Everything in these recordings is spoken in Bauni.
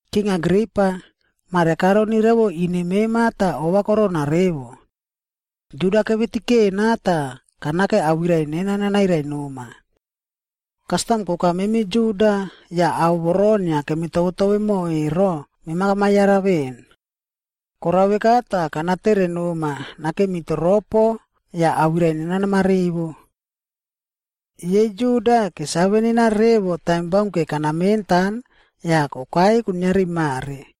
“King Agripa, mare karoni revo ine mema tah ova korona revo. Juda kevitikena tah kanake awirai nena nanairai noma. Kastam koka memi Juda yah ao voro inia kemitovetove mo ero, mema kamayara veꞌen. Korao veka tah, kanatere noma nakemi toropo yah awirai nena namarivo. “Yei Juda kesave nena revo taim baunke kanamentan yah kokai kuiniari mare.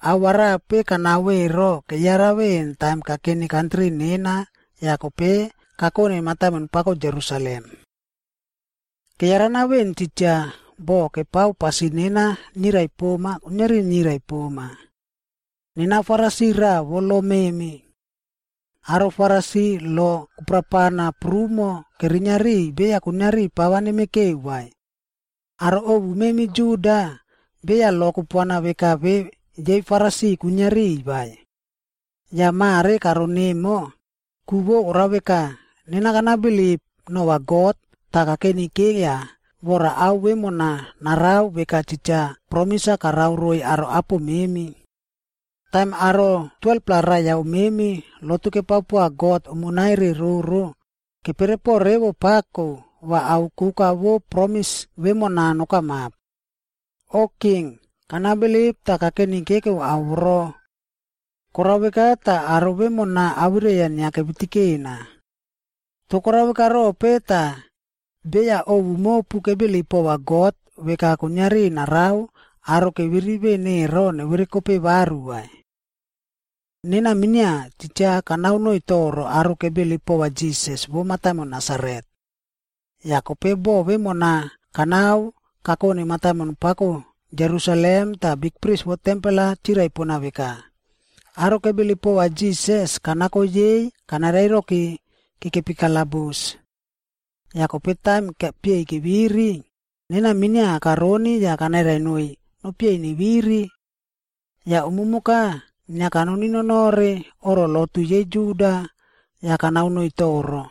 Ao arape kanao ero keyara veꞌen taim kakeni kantri nenaa yah kope kakone mataimon pako Jerusalem. Keyarana veꞌen titja, boh kepao pasin nena nirai poma, kuiniari nirai poma. Nena Farisi raꞌa vo lo memi. Aro Farisi lo kuprapana prumo kerinia riꞌiy beya kuiniari pava nemekeu vai. Aro ovu memi Juda, beya lo kupuana veka ve yei Farisi kwinia riꞌiy vai. Yah mare karon emo, ku vo korao veka, nena kanabilip nova God tah kakenikeiya vora ao vemona narao veka titja promis-a karao roiy aro apo memi. Taim aro 12-pla raiyau memi lotu kepao poa God umonai re roro, keperepo revo pako va ao koka vo promis vemona nokamap. O king, kanabilip tah kakenikekeu ao voro. Korao veka tah, aro vemona awirai-a inia kavitikena. Toh korao veka rope tah, beya ovu mopu kebilip pova God veka kuiniari narao aro keviri veꞌen ero neverekope varu vai? “Nena minia, titja kanao noiy toro aro kebilip pova Jisas vo mataimon Nasaret. Yah kope bo vemona kanao kakone mataimon pako Jerusalem tah bikpris vo tempel-a chirai pona veka, aro kebilip pova Jisas kanako yei kanarairoki kekepi kalabus. Yah kope taim kepieiy keviri, nena minia karoni yah kanairai noiy nopieiy neviri. Yah umumoka inia kanononore oꞌro lotu yei Juda yah kanao noiy toro.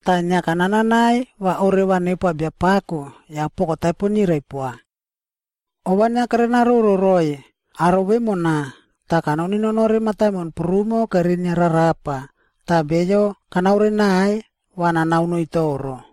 Tah inia kananai va oreva nepoa Biapako yah poko taipo nirai poa. Ova inia kerenaroro roiy aro vemona tah kanononore mataimon prumo kerinia rarapa tah beyo kanaore naiy va nanao noiy toro.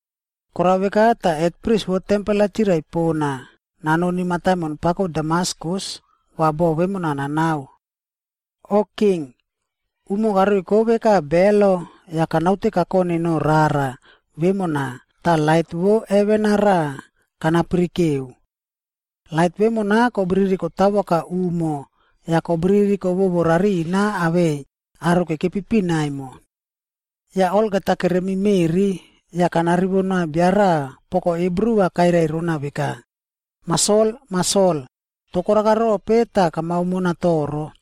“Korao veka tah, bikpris vo tempel-a chirai pona nanoni mataimon pako Damaskus va bo vemona nanao. O king, umo karoiko veka belo yah kanaute kakone no rara vemona tah lait vo heven-a raꞌa kanapirikeu. Lait vemona kobiriri kotawoka umo yah kobiriri kowowo rarina awei aro kekepi pina emo. Yah olgeta keremi meꞌri, yah kanarivo noa bia raꞌa poko Hibru-a kairai rona veka, ‘Mah Sol, Mah Sol, toh korakarope tah kamao mona toro?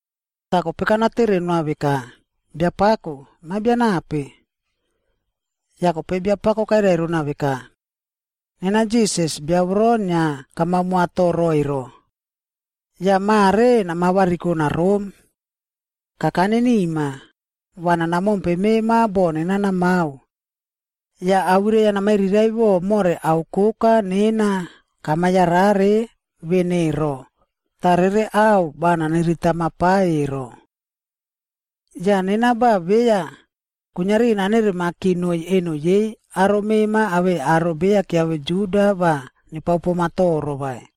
“Tah kope kanatere noa veka, ‘Biapako, mema bia nape?’ “Yah kope Biapako kairai rona veka, ‘Nena Jisas, bia voro inia kamao moa toro ero? Yah mare nama variko narom. Kakane nima, va nana mompe mema bo nena namao. Yah awirai-a namairiraiꞌvo more ao koka nena kama yarare veꞌen ero, tah rere ao va naniritama pa ero. Yah nena va beya kuiniari nana rokonerimaki noiy eno yei aro mema awei aro beya kiave Juda va nepao poma toro vai.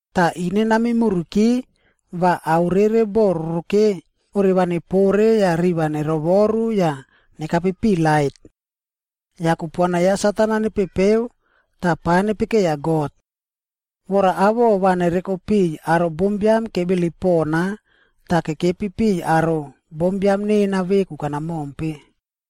tah ine nameimuriki va ao rere bo roroke orevanepore yah riꞌi va nerovoru yah nekape piꞌi lait. Yah kupuana ya Satan-a nepepeu tah pa nepekeiya God. Vora awoꞌo va nereko piꞌiy aro bombiam kebilip pona tah kekepi piꞌiy aro bombiam nena veku kanamompe.’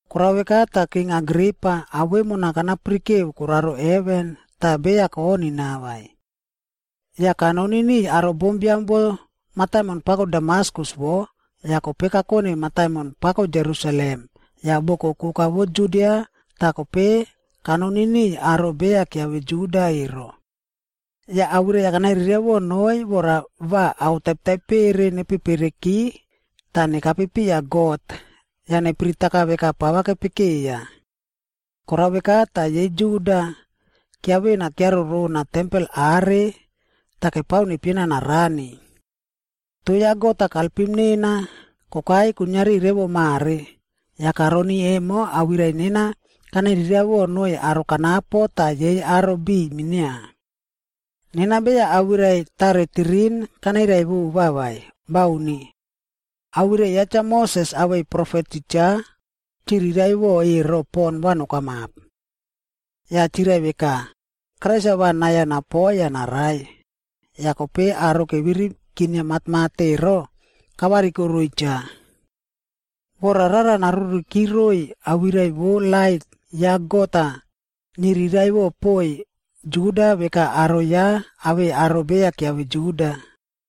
“Korao veka tah, King Agripa, ao vemona kanapirikeu koraro heven tah beya konina vai. Yah kanoni niꞌiy aro bombiam vo mataimon pako Damaskus wo, yah kope kakone mataimon pako Jerusalem yah boko koka vo Judia tah kope kanoni niꞌiy aro beya kiave Juda ero. Yah awirai-a kanairiraiꞌvo noiy vora va ao taipetaipere nepepereki tah nekape piya God yah nepiritaka veka pava kepekeiya. Korao veka tah, yei Juda kiavena kiarorona tempel are tah kepao nepiena narani. Toh ya God-a kalpim nena kokai kuiniari revo mare, yah karoni emo awirai nena kanairiraiꞌvo noiy aro kanapo tah yei aro biꞌiy minia. Nena beya awirai taretirin kanairai vova vai, bauni. Awirai ya Cha Moses awei profet titja chiriraiꞌvo ero pon va nokamap. Yah chirai veka, Krais-a va nai-a napoi yah narai, yah kope aro keviri kinia matmat ero, kavariko roiy cha. Vora rara naruriki roiy awirai vo lait ya God-a niriraiꞌvo poiy Juda veka aro ya awei aro beya kiave Juda.”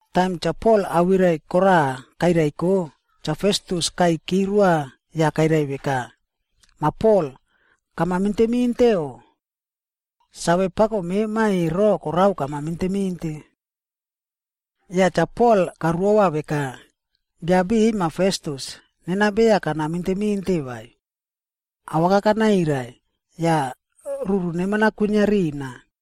Taim Cha Pol awirai koraꞌa kairaiko, Cha Festus kaiyki roa yah kairai roa veka, “Mah Pol kama minteminte o? Save pako mema ero korao kama minteminte.” Yah Cha Pol karuova veka, “Bia biꞌiy Mah Festus nena beya kana minteminte vai. Awaka kanairai, yah ruru neman-a kwinia rina.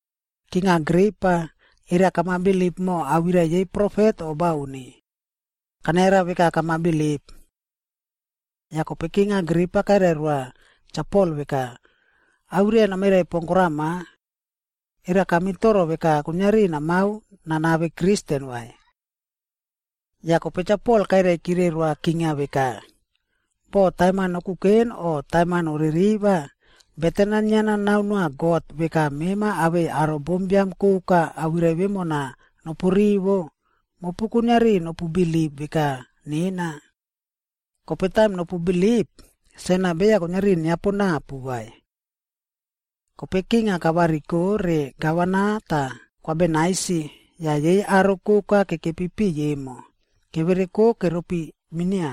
King Agripa, era kamabilip mo awirai yei profet o bauni? Kanayara veka kamabilip.” Yah kope King Agripa kairai roa Cha Pol veka, “Awirai-a namairai pon korama. Era kamitoro veka kuiniari namao nanave Kristen vai?” Yah kope Cha Pol kairaikire roa king-a veka, “Boh taim-a nokuken o taim-a noririva, beten-a inia nanao noa God veka mema awei aro bombiam koka awirai vemona nopurivo, mopu kuiniari nopu bilip veka nena. Kope taim nopubilip, sen-a beya kuiniari niaponapu vai.” Kope king-a kavariko re Gavana tah Kwa Bernaisi yah yei aro koka kekepi piꞌiy emo, kevereko keropi minia.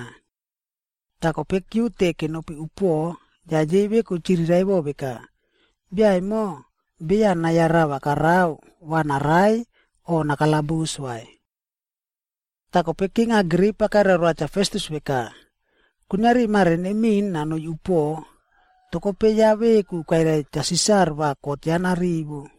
Tah kope kiute kenopi upuoꞌo, yah yei veku chiriraiꞌvo veka, “Bia emo beya nai-a rava karao va narai o nakalabus vai.” Tah kope King Agripa kairai roa Cha Festus veka, “Kuiniari mare nemiꞌin nanoi upuoꞌo, toh kope ya veku kairai Cha Sisar va kot ya narivo.”